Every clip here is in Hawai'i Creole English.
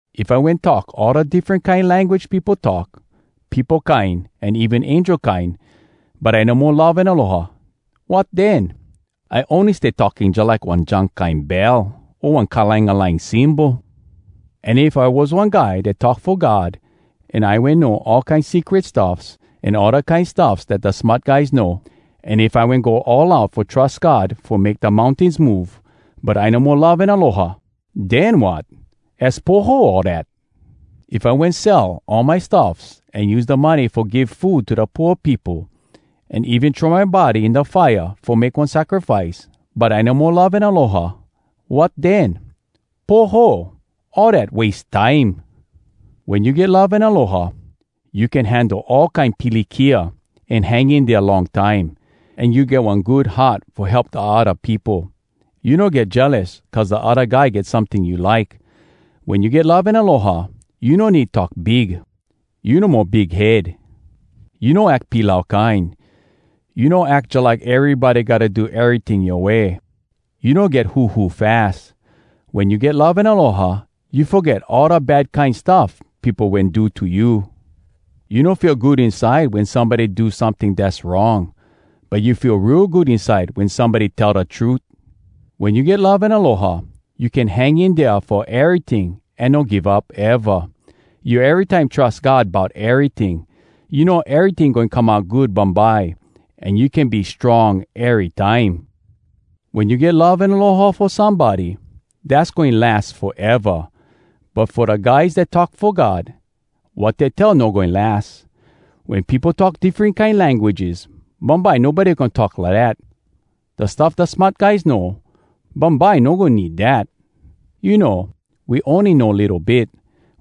If I wen talk all da diffren kine language peopo talk, peopo kine an even angel kine, but I no mo love an aloha, wat den? I ony stay talking jalike one junk kine bell o one kalangalang cymbal. An if I was one guy dat talk fo God, an I wen know all kine secret stuffs an all da kine stuffs dat da smart guys know, an if I wen go all out fo trus God fo make da mountains move, but I no mo love an aloha, den wat? Az poho all dat! If I wen sell all my stuffs an use da money fo give food to da pooa peopo, an even throw my body in da fire fo make one sacrifice, but I no mo love an aloha, wat den? Poho! All dat wase time! Wen you get love an aloha, you can handle all kine pilikia an hang in dea long time. An you get one good heart fo help da odda peopo. You no get jealous cuz da odda guy get someting you like. Wen you get love an aloha, you no need talk big. You no mo big head. You no ack pilau kine. You no ack jalike erybody gotta do eryting yoa way. You no get huhu fas. Wen you get love an aloha, you foget all da bad kine stuff peopo wen do to you. You no feel good inside wen somebody do someting dass wrong, but you feel real good inside wen somebody tell da trut. Wen you get love an aloha, you can hang in dea fo eryting an no give up eva. You erytime trus God bout eryting. You know eryting goin come out good bumbye. An you can be strong erytime. Wen you get love an aloha fo somebody, dass goin las foeva. But fo da guys dat talk fo God, wat dey tell no goin las. Wen peopo talk diffren kine languages, bumbye nobody goin talk lidat. Da stuff da smart guys know, bumbye no goin need dat. You know, we ony know litto bit.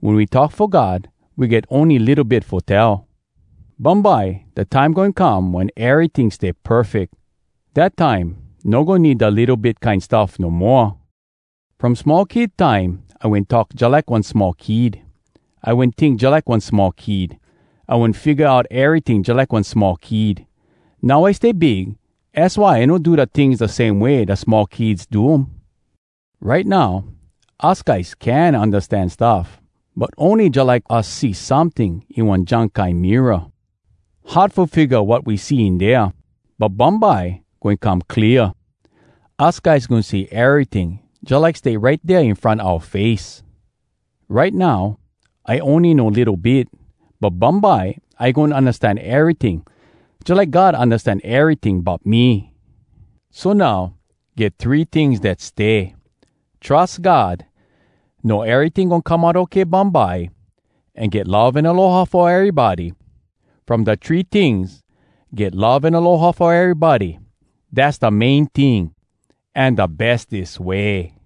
Wen we talk fo God, we get ony litto bit fo tell. Bumbye, da time goin come wen eryting stay perfeck. Dat time, no goin need da litto bit kine stuff no moa. From small kid time, I wen talk jalike one small kid. I wen tink jalike one small kid. I wen figga out eryting jalike one small kid. Now I stay big, az why I no do da tings da same way da small kids do um. Right now, us guys can undastan stuff, but ony jalike us see someting in one junk kine mirror. Hard fo figga wat we see in dea. But bumbye, goin come clear. Us guys goin see eryting jalike stay right dea in front oua face. Right now, I ony know litto bit. But bumbye, I goin undastan eryting, jalike God undastan eryting bout me. So now, get three tings dat stay: trus God, know eryting goin come out okay bumbye, an get love an aloha fo erybody. From da three tings, get love an aloha fo erybody, dass da main ting, an da bestes way!